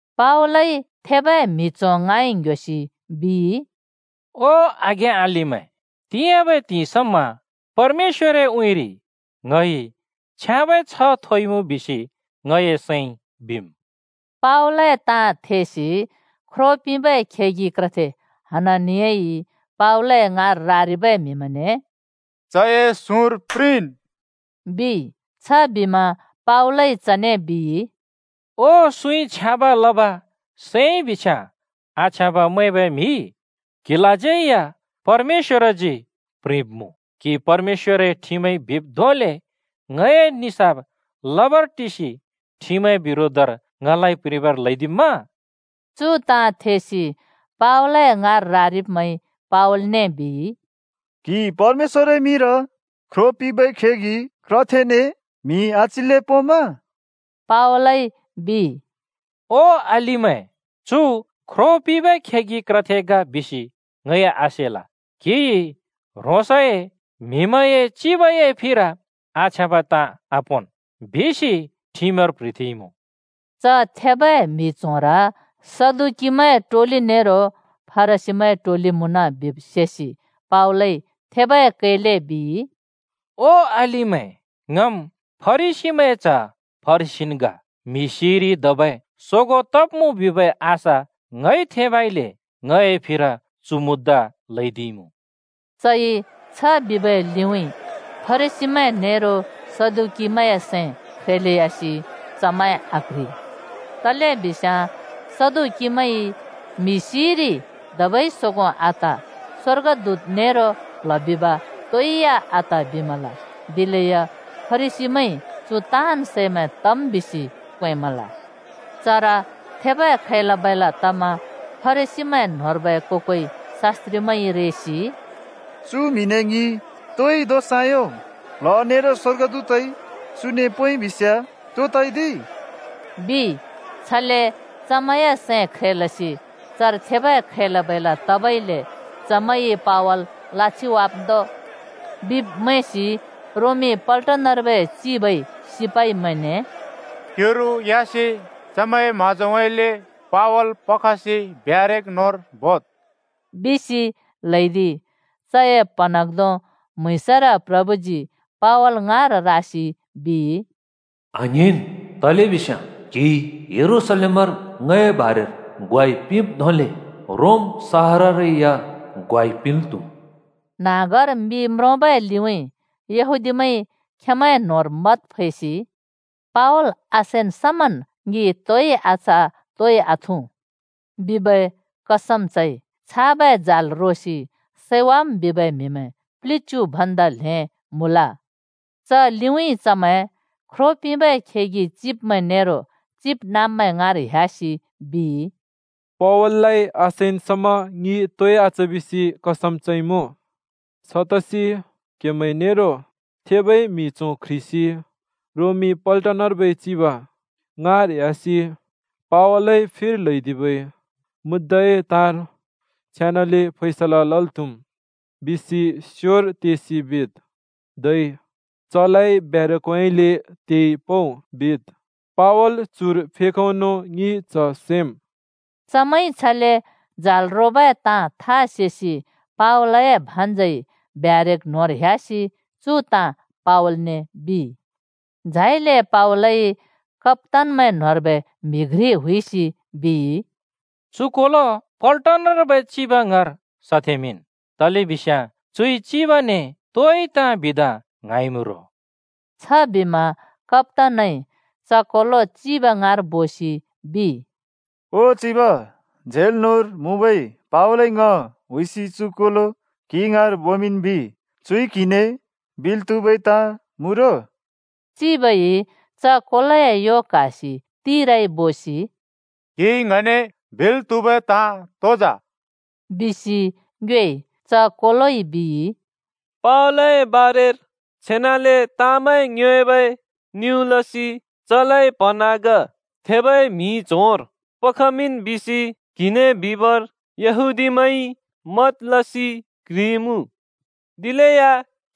पावलइ थेबै म्हि च्हों ङाँइ ङ्ह्‍योसि बिइ, “ओ आघें-अलिमैं, तिंयाँबै त्हिंइ समा परमेश्‍वरए उँइँरि ङइ छ्याँबै छ्ह थोइमुँ बिसि ङए सैंइ बिम्।” पावलए ताँ थेसि ख्रो पिंबै खेगि क्रथे हननियाइ पावलए ङाँर रारिबै म्हिमैंने “चए सुँर प्रिंन्!” बिइ। छबिमा पावलइ चने बिइ, “ओ सुँइ छ्याँब लब सैंइ बिस्याँ आछ्याँब मैंबै म्हि! क्हिलाज्यै या परमेश्‍वरजी प्रिंब्मुँ। क्हि परमेश्‍वरए ठिमइ बिब् धोंले ङए निसाफ लबर टिसि ठिमए बिरोधर ङलाइ प्रिंबर ल्हैदिम्मा?” चु ताँ थेसि पावलए ङाँर रारिब्मैंइ पावलने बिइ, “क्हि परमेश्‍वरए मिंर ख्रो पिंबै खेगि क्रथेने म्हि आच्हिल्‍ले पोंम्मा?” पावलइ बिइ, “ओ अलिमैं, चु ख्रो पिंबै खेगि क्रथे ग बिसि ङइ आसेल। ‘क्हिइ ह्रोंसए म्हिमैंए चिबए फिर आछ्याँबै ताँ आपोंन्।’ बिसि ठिमर प्ह्रिथेंइँमुँ।” च थेबै म्हि च्होंर सदुकीमैंए टोलि नेरो फरिसीमैंए टोलि मुँन बिब सेसि पावलइ थेबै कैले बिइ, “ओ अलिमैं, ङम् फरिसीमैंए च्ह फरिसीन् ग। म्हि सिइरि धबै सोगों तब्मुँ बिबै आशा ङइ थेंबइले ङए फिर चु मुद्दा ल्हैदिइमुँ।” चइ छ बिबै लिउँइँ फरिसीमैं नेरो सदुकीमैंए सैं ख्रेलेयासि चमैं आक्ह्रि। तलेबिस्याँ सदुकीमैंइ म्हि सिइरि धबै सोगों आत, स्वर्गदूत नेरो प्ल्ह बिब तोइ या आत बिमल। दिलेया फरिसीमैंइ चु ताँन् सैमैं तम् बिसि क्वेंमल। चर थेबै खैला-बैला तमा फरिसीमैं न्होंर्बै को-कोइ शास्‍त्रिमैंइ रेसि “चु म्हिने ङिइ तोइ दोष आयों। प्ल्ह नेरो स्वर्गदूतइ चुने पोंइ बिस्याँ तो तइ दि?” बिइ। छले चमैंए सैं ख्रेलसि चर थेबै खैला-बैला तबइले “चमैंइ पावल लाछिवाम्दो!” बिब् मैंसि रोमी पल्टनर्बै चिबइ सिपाइमैंने “क्युरु ह्‍यासि चमैंए म्हाँजोउँइँले पावल पखसि ब्यारेक न्होंर बोद्,” बिसि ल्हैदिइ। चए प्हँन्हाँग्धों म्‍हुँइँसर प्रभुजी पावल ङाँर रासि बिइ, “आङ्हिंन्, तलेबिस्याँ क्हिइ यरूशलेमर ङए बारेर ग्वाइ पिंब् धोंले रोम शहाररै या ग्वाइ पिंल् त्हुम्।” न्हाँगर मि म्रोंबै लिउँइँ यहूदीमैंइ खेंमैंए न्होंर मत फैसि “पावल आसैन् समन् ङि तोइ आच तोइ आथुँ,” बिबै कसम चइ। छाबै जाल रोसि सैवाम् बिबै म्हिमैं प्लिच्यु भन्दा ल्हें मुँल। च लिउँइँ चमैं ख्रो पिंबै खेगि चिब्मैं नेरो चिबनाँब्मैं ङाँर ह्‍‍यासि बिइ, “पावल आसैन् समा ङि तोइ आच बिसि कसम चइमुँ। छतसि क्हेमैं नेरो थेबै म्हि च्हों क्ह्रिसि रोमी पल्टनर्बै चिब ङाँर ह्‍यासि ‘पावलए फिर ल्हैदिबै मुद्दाए ताँर छेनाले फैसला लल् त्हुम्,’ बिसि स्योर तेसि बिद्। धै ‘चलाइ ब्यारकउँइँले तेइ पउ,’ बिद्। पावल चुर फेखउनो ङिइ च सैम्।” चमैंइ छले जाल रोबै ताँ था योंसि पावलए भान्जइ ब्यारेक न्होंर ह्‍यासि चु ताँ पावलने बिइ। झाइले पावलइ कप्‍तानमैं न्होंर्बै म्हि घ्रि हुइसि बिइ, “चु कोलो पल्टनर्बै चिब ङाँर सथेमिंन्, तलेबिस्याँ चुइ चिबने तोइ ताँ बिदा ङ्हाँइँमु रो।” छबिमा कप्‍तानइ च कोलो चिब ङाँर बोसि बिइ, “ओ चिब, झेल न्होंर मुँबै पावलइ ङ हुइसि चु कोलो क्हि ङाँर बोमिंन् बिइ। चुइ क्हिने बिल् त्हुबै ताँ मुँ रो।” चिबइ च कोलोए यो क्हासि तिराइ बोसि “क्हिइ ङने बिल् त्हुबै ताँ तो जा?” बिसि ङ्योएइ। च कोलोइ बिइ, “पावलए बारेर छेनाले ताँमैं ङ्योएबै निउँ लसि ‘चलाइ प्हँन्हाँग थेबै म्हि च्होंर पखमिंन्’ बिसि क्हिने बिबर यहूदीमैंइ मत लसि क्‍ह्रिइमुँ। दिलेया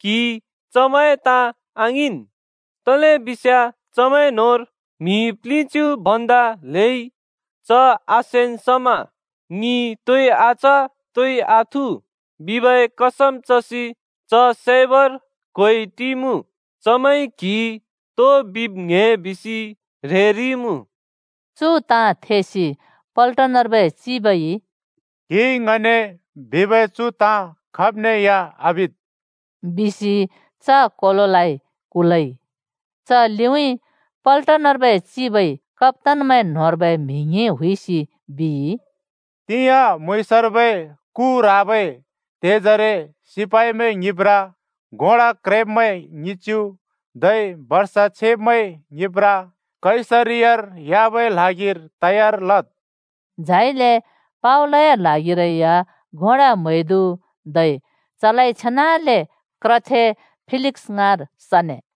क्हिइ चमैंए ताँ आङिंन्, तलेबिस्याँ चमैं न्होंर म्हि प्लिच्यु भन्दा ल्हेइ ‘च आसैन् समा ङि तोइ आच तोइ आथुँ!’ बिबै कसम चसि च सैबर क्ह्‍वेइ टिइमुँ। चमैंइ क्हिइ तो बिब् ङ्‍हे बिसि ह्रेरिइमुँ।” चु ताँ थेसि पल्टनर्बै चिबइ “क्हिइ ङने बिबै चु ताँ खाब्ने या आबिद्,” बिसि च कोलोलाइ कुलइ। च लिउँइँ पल्टनर्बै चिबइ कप्‍तानमैं न्होंर्बै म्हि ङ्हिं हुइसि बिइ, “तिंयाँ म्‍हुँइँसर्बै कु ह्राबै त्हेजरे सिपाइमैं ङ्हिंब्ब्रा, घोडा क्रेब्मैं ङिच्यु, धै बर्षा छेब्मैं ङ्हिंब्ब्रा कैसरियार ह्‍याबै ल्हागिर तयार लद्।” झाइले पावलए ल्हागिरै या घोडा म्हैदु धै चलाइ छेनाले क्रथे फेलिक्स ङाँर सने।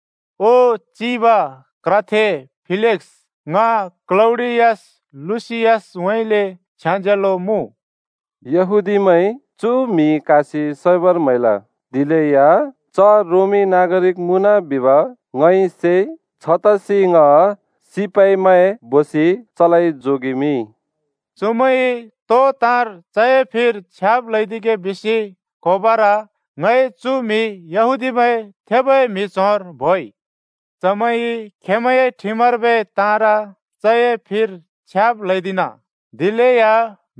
“ओ चिब, क्रथे फेलिक्‍स, ङ क्‍लौडियस लुसियसउँइँले छ्याज्यालो मुँ! यहूदीमैंइ चु म्हि क्हासि सैबर म्हैल, दिलेया च रोमी नागारिक मुँन बिब ङइ सेइ। छतसि ङ सिपाइमैं बोसि चलाइ जोगेमिंइ। चुमैंइ तो ताँर चए फिर छ्याब् ल्हैदिगे बिसि क्होबर ङइ चु म्हि यहूदीमैंए थेबै म्हि च्होंर बोइ। चमैंइ खेंमैंए ठिमर्बै ताँर चए फिर छ्याब् ल्हैदिना, दिलेया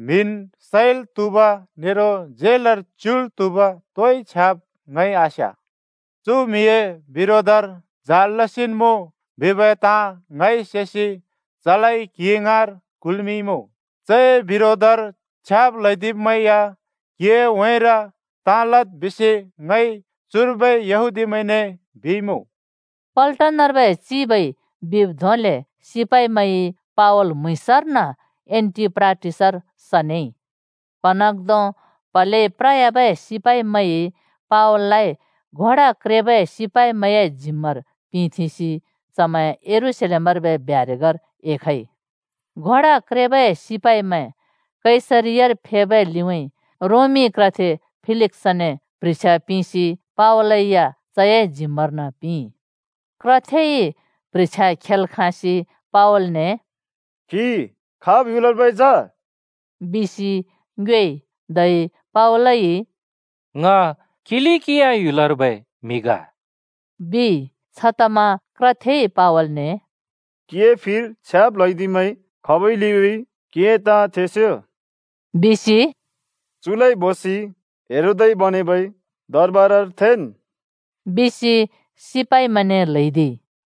म्हिन् सैल् त्हुब नेरो झेलर च्युल् त्हुब तोइ छ्याब् ङइ आस्या। चु म्हिए बिरोधर जाल लसिन् मुँ बिबै ताँ ङइ सेसि चलाइ क्हि ङाँर कुल्मिंइँमुँ। चए बिरोधर छ्याब् ल्हैदिब्मैं या क्हिए उँइँर ताँ लद् बिसि ङइ चुर्बै यहूदीमैंने बिइमुँ।” पल्टनर्बै चिबइ बिब् धोंले सिपाइमैंइ पावल म्‍हुँइँसर्न एन्‍टिपाट्रिस बिबै नाँसर सनेइ। प्हँन्हाँग्धों प्हलेइ प्रयाबै सिपाइमैंइ पावललाइ घोडा क्रेबै सिपाइमैंए जिम्मार पिंथेंसि यरूशलेमर्बै ब्यारेकर एखइ। घोडा क्रेबै सिपाइमैं कैसरियार फेबै लिउँइँ रोमी क्रथे फेलिक्‍सने प्ह्रिछ्या पिंसि पावल या चए जिम्मर्न पिंइ। क्रथेइ प्ह्रिछ्या खेल् खाँसि पावलने “क्हि खाब् ह्‍युलर्बै जा?” बिसि ङ्योएइ। धै पावलइ “ङ किलिकिया ह्‍युलर्बै म्हि ग,” बिइ। छतमा क्रथेइ पावलने “क्‍हिए फिर छ्याब् ल्हैदिब्मैं खबै लिउँइँ क्हिए ताँ थेस्यो!” बिसि “चुलाइ बोसि हेरोदइ बनेबै दरबारर थेंन्,” बिसि सिपाइमैंने ल्हैदिइ।